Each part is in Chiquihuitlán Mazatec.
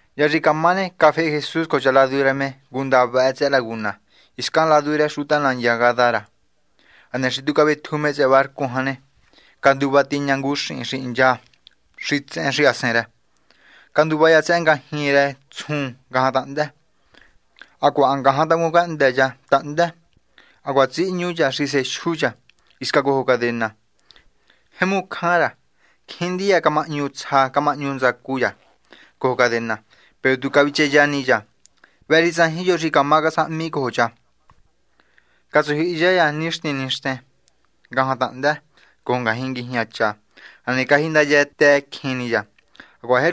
Hya xi camá ne, cafehe Jesús cojo cha ladu rë me ngunda vëhë tsëhë laguna, hiscan ladu rë xuta nandya Gadara. Hane xi cavetju me barcu jan, canduva tiña ngu xihin xi hincha xitsehen xahasen rë, canduva cha tsëhë ngajñi rë tsjun ngajan tahndë. Hacuaha ha ngajan tacun cahndë cha tahndë. Hacuaha tjihñu cha xi sejyu cha hisca cojo cadena. Jemu cjan rë cha, cjín ndiya camahñu tsja camahñu ntsacu cha cojo cadena, peru tu cavicheya ni cha. Vëhë xi tsajin yo xi cama casahmi cojo cha. Catsujyihiya cha nixtin nixten ngajan tahndë cojo ngajñi nguijña cha. Hane cajindayatëcjin ni cha, hacuaha cavanguihmucjin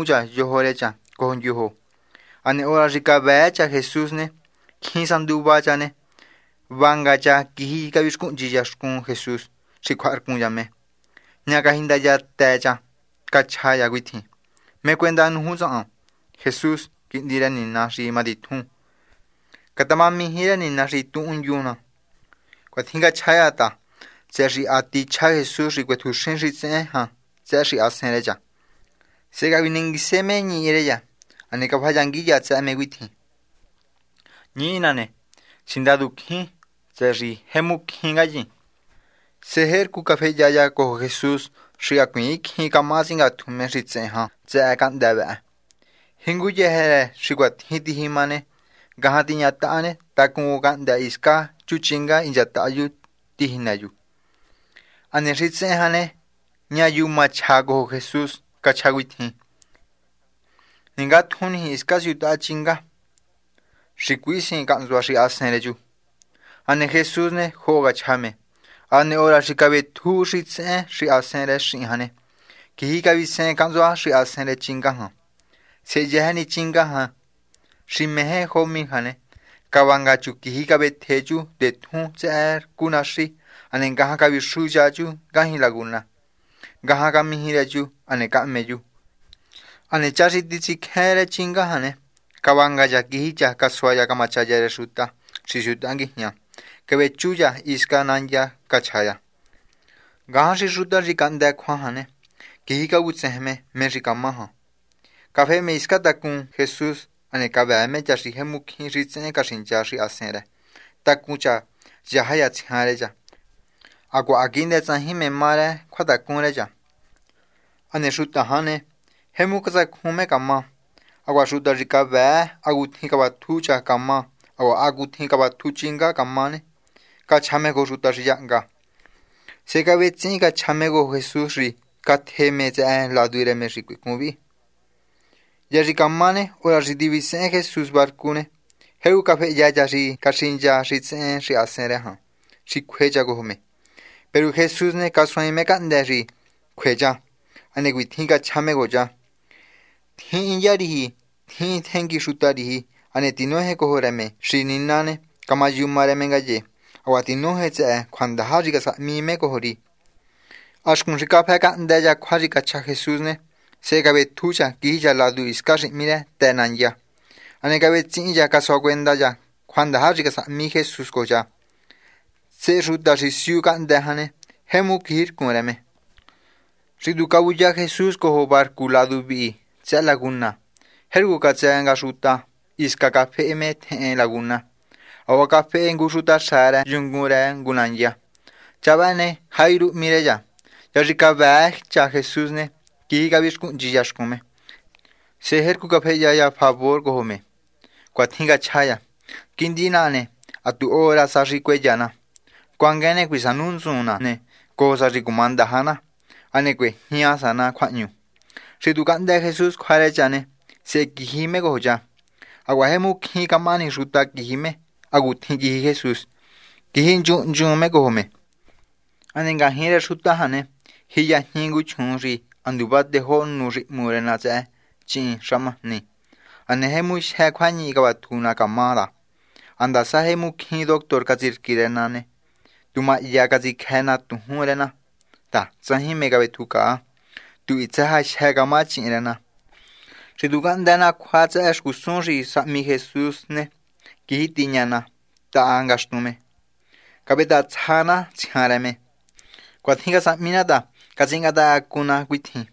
ni cha yojo rë cha cojo ndyojo. Hane hora xi cavëë cha Jesús ne, cjin sa nduva cha ne, vanga cha quiji cavixcuhnchi cha xcun Jesús xi cjuaharcun cha me. Ña cajindayatë cha cachja cha cuitjin: ―¿Mé cuenda nuju tsahan, Jesús, Quihndi rë Nina xi matitjun? Catamaniji rë Nina xi tuhundyun ná. Cuatjin cachja cha ta tsëhë xi ha tichja Jesús xi cuetjuxin xitsehen jan tsëhë xahasen rë cha. Sehe cavinenguise me ñihi rë cha. Hane cafayangui cha tsëhë me cuitjin: ―Ñihi naha ne, Sindadu Cjín, tsëhë xi jemu cjín ngayin. Sehe jercu cafehya cha cojo Jesús xi hacuiin cjín camaha tsingatju me xitsehen jan tsëhë cahndë́ vëhë. Jinguyëjë rë xi cuatjin tijima ne, ngajan tiñataha ne, tacun ngu cahndë́ hiscan chu chinga hinchataha chu tijinë chu. Hane xitsehen jan ne, ña yuma chja cojo Jesús cachja cuitjin: ―Ningatjun niji hiscan siutaha chinga, xi cuisihin cahntsua xahasen rë chu. Hane Jesús ne, joho cachja me. Hane hora xi cavetju xitsehen xahasen rë xihin jan ne, quiji cavisehen cahntsua xahasen rë chinga jan. Sehe yëjë ni chinga jan, xi meje jo mil jan ne, cavanga chu quiji cavetje chu ngu ndetjun tsëhë rcu naxi hane ngajan cavixuya chu ngajñi laguna. Ngajan camiji rë chu, hane cahme chu. Hane cha xi titsicjén rë chinga jan ne, cavanga cha quiji cha. Casua cha camachaya rë xuta xi siutaha nguijña, cavechu hisca nandya cachja cha. Ngajan xi xuta xi cahndë cjua jan ne, quiji cavutsejen me mé xi camá jan. Cafehe me hisca tacun Jesús, hane cavëë me cha xi jemu cjín xitsehen caxincha xahasen rë, tacun cha, yaja cha tsjian rë cha, hacuaha ha quihndë tsajin mé má rë cjuatacun rë cha. Hane xuta jan ne, jemu catsacjun me camá. Hacuaha xuta xi cavëë hacutjin cavatju cha camá hacuaha hacutjin cavatju chinga camá ne, cachja me cojo xuta xi yahnga. Sehe cavetsihin cachja me cojo Jesús xi catje me tsëhë ladu rë me xi cuicun vi. Hya xi camá ne, hora xi tivisehen Jesús barcu ne, jercu cafehya cha xi caxincha xitsehen xahasen rë jan xi cjue cha cojo me. Peru Jesús ne casuaain me cahndë́ xi cjue cha. Hane cuitjin cachja me cojo cha: ―Tjihin ndya riji. Tjihin tjengui xuta riji, hane tinoje cojo rë me xi Nina ne, camayuma rë me ngaye. Hacuaha tinoje tsëhë cjuandaja xi casahmi me cojo ri. Ha xcun xi cafë cahndë cha cjua xi cachja Jesús ne, sehe cavetju cha quiji cha ladu hiscan xi hmí rë Të Nandya. Hane cavetsihin cha casuacuenda cha cjuandaja xi casahmi Jesús cojo cha. Sehe xuta xi siu cahndë́ jan ne, jemu quijircun rë me. Xi tu cavuya nga Jesús cojo barcu ladu vihi tsëhë laguna ne, jercu catsë nga xuta hiscan cafehe me tjehen laguna. Hacuaha cafehe ngu xutaxa rë yungun rë ngu nandya. Cha vëhë ne, Jairo hmí rë cha. Hya xi cavëë cha Jesús ne, quiji cavixcuhnchi cha xcun me. Sehe jercu cafehya cha favor cojo me. Cuatjin cachja cha: ―Quihndi naha ne, ha tu hora sa xi cueya na. Cuanguen ne, cuisanu ntsun na ne, cojo sa xi cumandaja na, hane cuejña sa na cjuahñu. Xi tu cahndë Jesús cjua rë cha ne, sehe quiji me cojo cha. Hacuaha jemu cjín camahani xuta quiji me hacutjin quiji Jesús. Quiji hnchun hnchun me cojo me. Hane ngajñi rë xuta jan ne, jiyajñi ngu chjuun xi ha nduva tejó nu xi hmu rë na tsëhë chíhin xahmajni. Hane jemu jyë cjuañihi cavatju na camá ta ha ndasa jemu cjín doctor catsirqui me na, tu mahya catsicjë na tujún rë na ta tsajin mé cavetjucaa. Tu hitsë sa jyë camá chíhin rë na. Xi tu cahndë na cjua tsëhë xcusun xi casahmi Jesús ne, quiji tiña na taha ngaxtun me, cavetahatsja na tsjian rë me. Cuatjin casahmi na ta catsingatahacacun na cuitjin: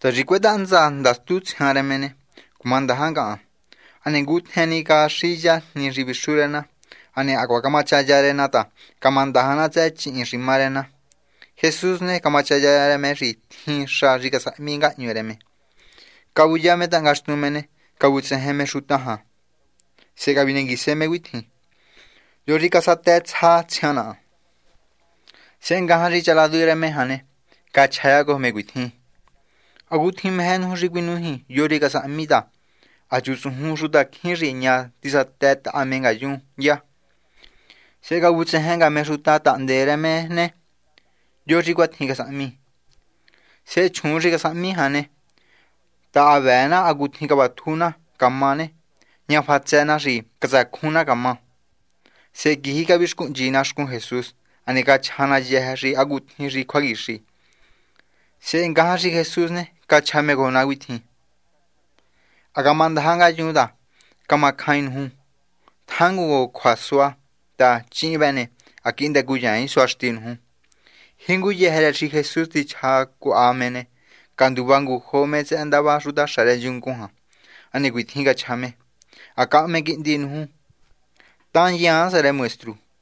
“Sá xi cuetaha ntsa ndastu tsjian rë me ne, cumandaja ngahan.” Hane ngutjen ni caxiya jni xi vixu rë na. Hane hacuaha camachaya rë na ta camandaja na tsëhë chíhin xi má rë na. Jesús ne, camachaya rë me xi tjin xa xi casahmi ngahñu rë me. Cavuya me taha ngaxtun me ne, cavutsejen me xuta jan ne, sehe cavinenguise me cuitjin: ―¿Yo xi casatëtsja tsjian naha? Sehe ngajan xi cha ladu rë me jan ne, cachja cha cojo me cuitjin: ―¿Hacutjin meje nuju xi cuinújin yo xi casahmi? ta ha chutsujun xutacjín xi ña tisatëtaha me ngayun ndya jan. Sehe cavutsejen nga me xuta tahndee rë me ne, ¿yo xi cuatjin casahmi? Sehe chjuun xi casahmi jan ne ta ha vëë na hacutjin cavatju na camá ne, ña fatsë na xi catsacjun na camá. Sehe quiji cavixcuhnchi na xcun Jesús, hane cachja na yëjë ni hacutjin xi cjuaquixi. Sehe ngajan xi Jesús ne, cachja me cojo na cuitjin: ―Ha camandaja ngayun ta camacjain nuju. Tjangun cojo cjuasua ta chíhin vë ne, ha quihndë cuyaain suaxti nuju. Jinguyëjë rë xi Jesús tichja cuaha me ne, canduva ngujo me tsëhë ndava xutaxa rë yungun jan. Hane cuitjin cachja me: ―Ha cahme quihndi nuju. Tahanndyaan sa rë maestru.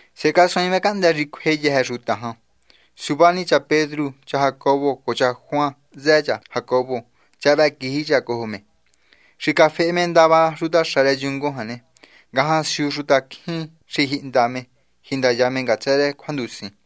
Sehe casuaain me cahndë́ xi cjue yëjë xuta jan. Suva ni cha Pedru, cha Jacobo cojo cha Juan hntsë cha Jacobo, cha vëhë quiji cha cojo me. Xi cafehe me ndava xutaxa rë yungun jan ne, ngajan siu xutacjín xi jihnda me jindaya me ngatsë rë cjuandusin.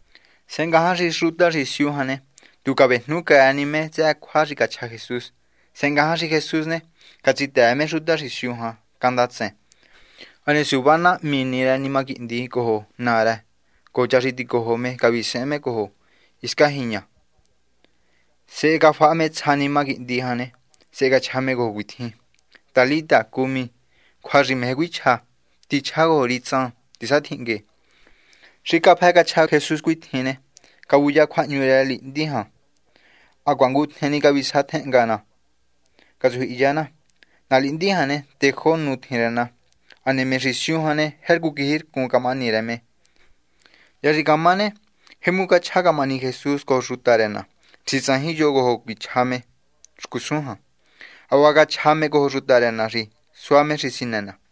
Sehe ngajan xi xuta xi siu jan ne, tu vejnucjëë me tsëhë cjua xi cachja Jesús. Sehe ngajan xi Jesús ne, catsitëë me xuta xi siu jan candatsen. Hane suva ni nahmi rë nima quihndi cojo naa rë cojo cha xi ticojo me cavisehen me cojo hiscan jiña. Sehe cafaha me tsja nima quihndi jan ne, sehe cachja me cojo cuitjin: ―Talita cumi ―cjua xi meje cuichja: Tichjá cojo ri, tsan, tisatjinhngue. Xi cafë cachja Jesús cuatjin ne, cavuya cjuahñu rë na lihndi jan hacuaha ngutjen ni cavisatjenhnga na catsujyihiya na. Na lihndi jan ne, tejó nu tjin rë na. Hane me xi siu jan ne, jercu quijircun camahani rë me. Hya xi camá ne, jemu cachja camahani Jesús cojo xuta rë na xi tsajin yo cuichja me cojo xcusun jan. Hacuaha cachja me cojo xuta rë na xi sua me xi sinë na.